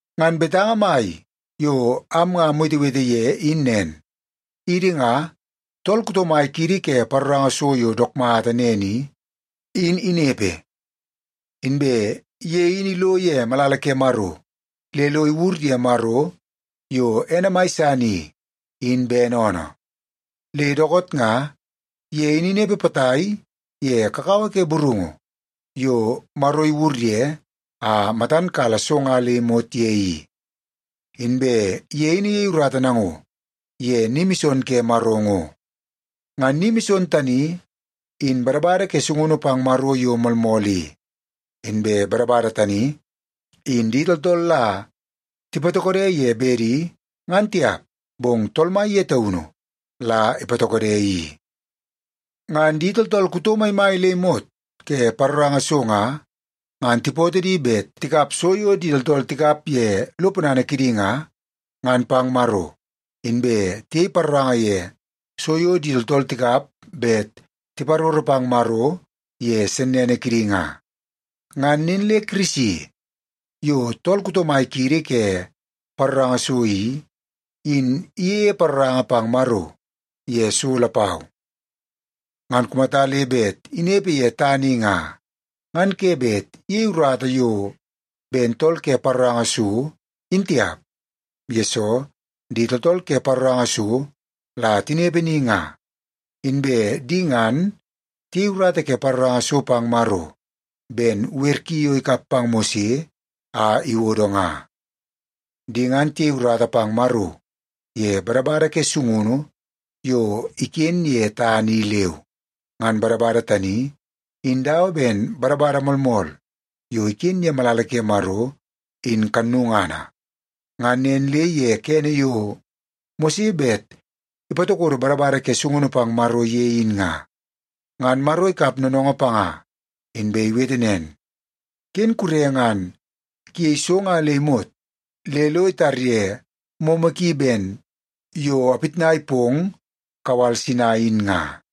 Ngan betanga mai yo am nga amwetewete ye in nen: Idi nga, tool kuto mai kiidi ke paroranga so yo dook mata nen i, in inepe. Inbe ye in ilo ye malala ke Maro le lo iwur ye Maro, yo ene mai san i, in bene oonoo. Le dookoot nga, ye in inepe potai ye kakawa ke burungu yo Maro iwur ye a matan kala so nga le imot ye i, inbe ye in iyei urata nango ye ni mison ke Maro ngo. Ngan ni mison tani, in badabada ke sungunu pang Maro yo moolmool i. Inbe badabada tani, in di tooltool la tipatokode ye bedi, ngan tiap, bong Tool Mai ye taunu la ipatokode i. Ngan di tooltool kuto maimai le imot ke paroranga so nga, ngan tipootoo di bet tikap so yo di tooltool tikap ye lo ponana kidi nga, ngan pang Maro. Inbe tiyei paroranga ye so yo di tooltool tikap bet tiparoro pang Maro ye sennene kidi nga. Ngan nen le Kirisi, yo tool kuto mai kiidi ke paroranga so i, in iyeie paroranga pang Maro ye so lapau. Ngan kumata le bet inepe ye tana i nga, ngan ke bet iyei urata yo ben tool ke paroranga so, in tiap. Yesoo, di tooltool ke paroranga so la tinepe ni nga, inbe di ngan tiyei urata ke paroranga so pang Maro ben wer ki yo ikap pang Mose a iwodo nga. Di ngan tiyei urata pang Maro ye badabada ke sungunu yo iken tana i leu. Ngan badabada tani in dawa ben badabada moolmool yo iken ye malala ke Maro, in kannungana. Ngan nen le ye kene yo Mose bet ipatokodo badabada ke sungunu pang Maro ye in nga, ngan Maro ikap noonoongoo panga inbe iwete nen, “Ken kure ngan kuyei so nga le imot le lo itarye momo ki ben yo apitnai pong kawal Sinai in nga.”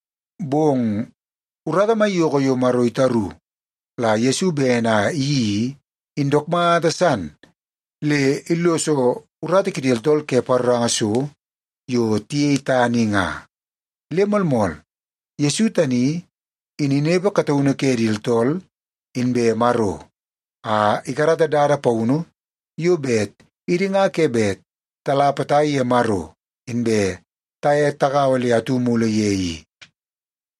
Bong urata maiyoko yo Maro itaru la Yesu bene a iyeii i, in dook mata san le illoso urata kidi tooltool ke paroranga so yo tiyei tana i nga. Le moolmool, Yesu tani in inepe kataunu ke di tooltool inbe Maro, a ikarata dada paunu yo bet idi nga ke bet tala potai ye Maro inbe taye tagaua le atu mulu ye i.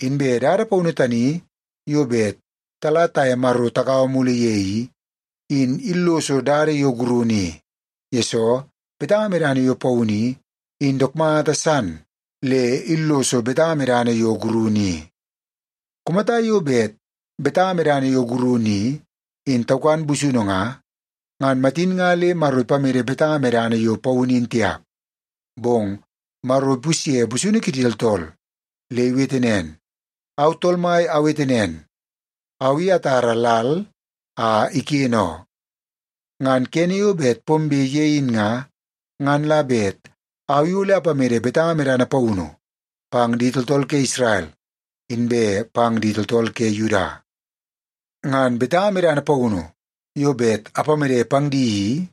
Inbe dada paunu tani yo bet tala taye Maro tagaua mulu ye i, in illoso dada yo gurunu i, yesoo betanga medana yo paunu i, in dook mata san le illoso betanga medana yo gurunu i. Kumata yo bet betanga medana yo gurunu i, in taukan busunu nga, ngan matin nga le Maro ipamede betanga medana yo paunu in tiap. Bong Maro ipusye busunu kidi tooltool, le iwete nen, “Au Tool Mai awete nen, au i atara lal a iken oo. Ngan kene yo bet pombe ye in nga, ngan la bet au i ole apamede betanga medana paunu pang di tooltool ke Isrel, inbe pang di tooltool ke Yuda. Ngan betanga medana paunu yo bet apamede pang di i,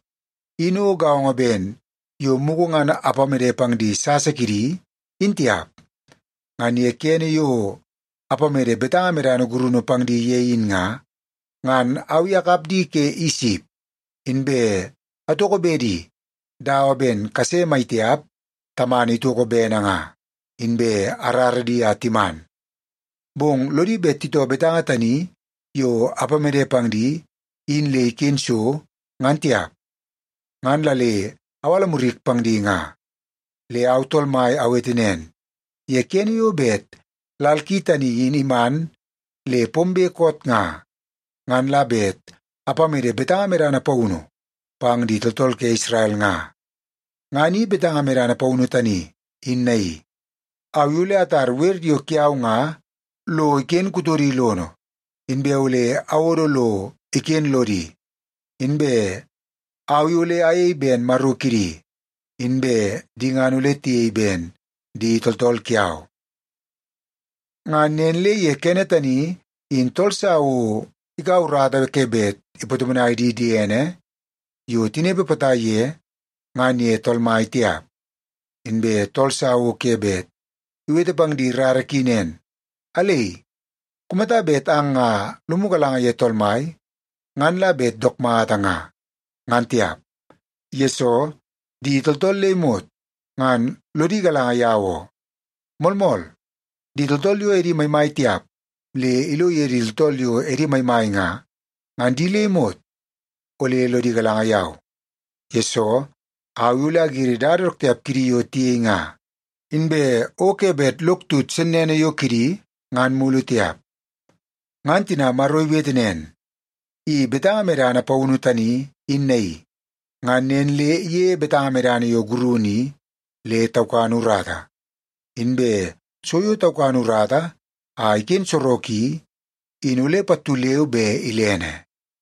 in o gaongo ben yo mugu ngan apamede pang di sasa kidi, in tiap. Ngan ye kene yo apamede betanga medana gurunu pang di ye in nga, ngan au i akap di ke Isip, inbe atoko bedi dawa ben kase maitiap tamana itoko bene nga, inbe arara di a timan. Bong lodi bet titoo betanga tani yo apamede pang di, in le iken so, ngan tiap, ngan la le awala murik pang di nga. Le au Tool Mai awete nen, ye kene yo bet lal ki tani in iman le pombe koot nga, ngan la bet apamede betanga medana paunu pang di tooltool ke Isrel nga. Ngan i betanga medana paunu tani, in naii: Au i ole atar wer yo kiau nga lo iken kutodi lono, inbe ole awodo lo iken lodi. Inbe au i ole ayei ben Maro kidi, inbe di ngan ole tiyei ben di tooltool kiau. Ngan nen le ye kene tani, in tool sa o ikaua urata ke bet ipatomonai di diene yo tinepe potai ye, ngan ye Tool Mai tiap. Inbe tool sa o ke bet iwete pang di rara ki nen, ‘Alei, kumata bet ang nga lomu galanga ye Tool Mai, ngan la bet dook mata nga,’ ngan tiap. Yesoo, di tooltool le imot ngan lodi galanga yau oo. Moolmool, di tooltool yo edi maimai tiap le ilo ye di tooltool yo edi maimai nga, ngan di le imot ole lodi galanga yau. Yesoo, au i ole agiri dada dook tiap kidi yo tiyei nga, inbe o ke bet lok tut sennene yo kidi ngan mulu tiap.” Ngan tina Maro iwete nen, “I betanga medana paunu tani, in naii”, ngan nen le iyeie betanga medana yo gurunu i le taukan urata. Inbe so yo taukan urata a iken sorok i, in ole pattu leu be ilene.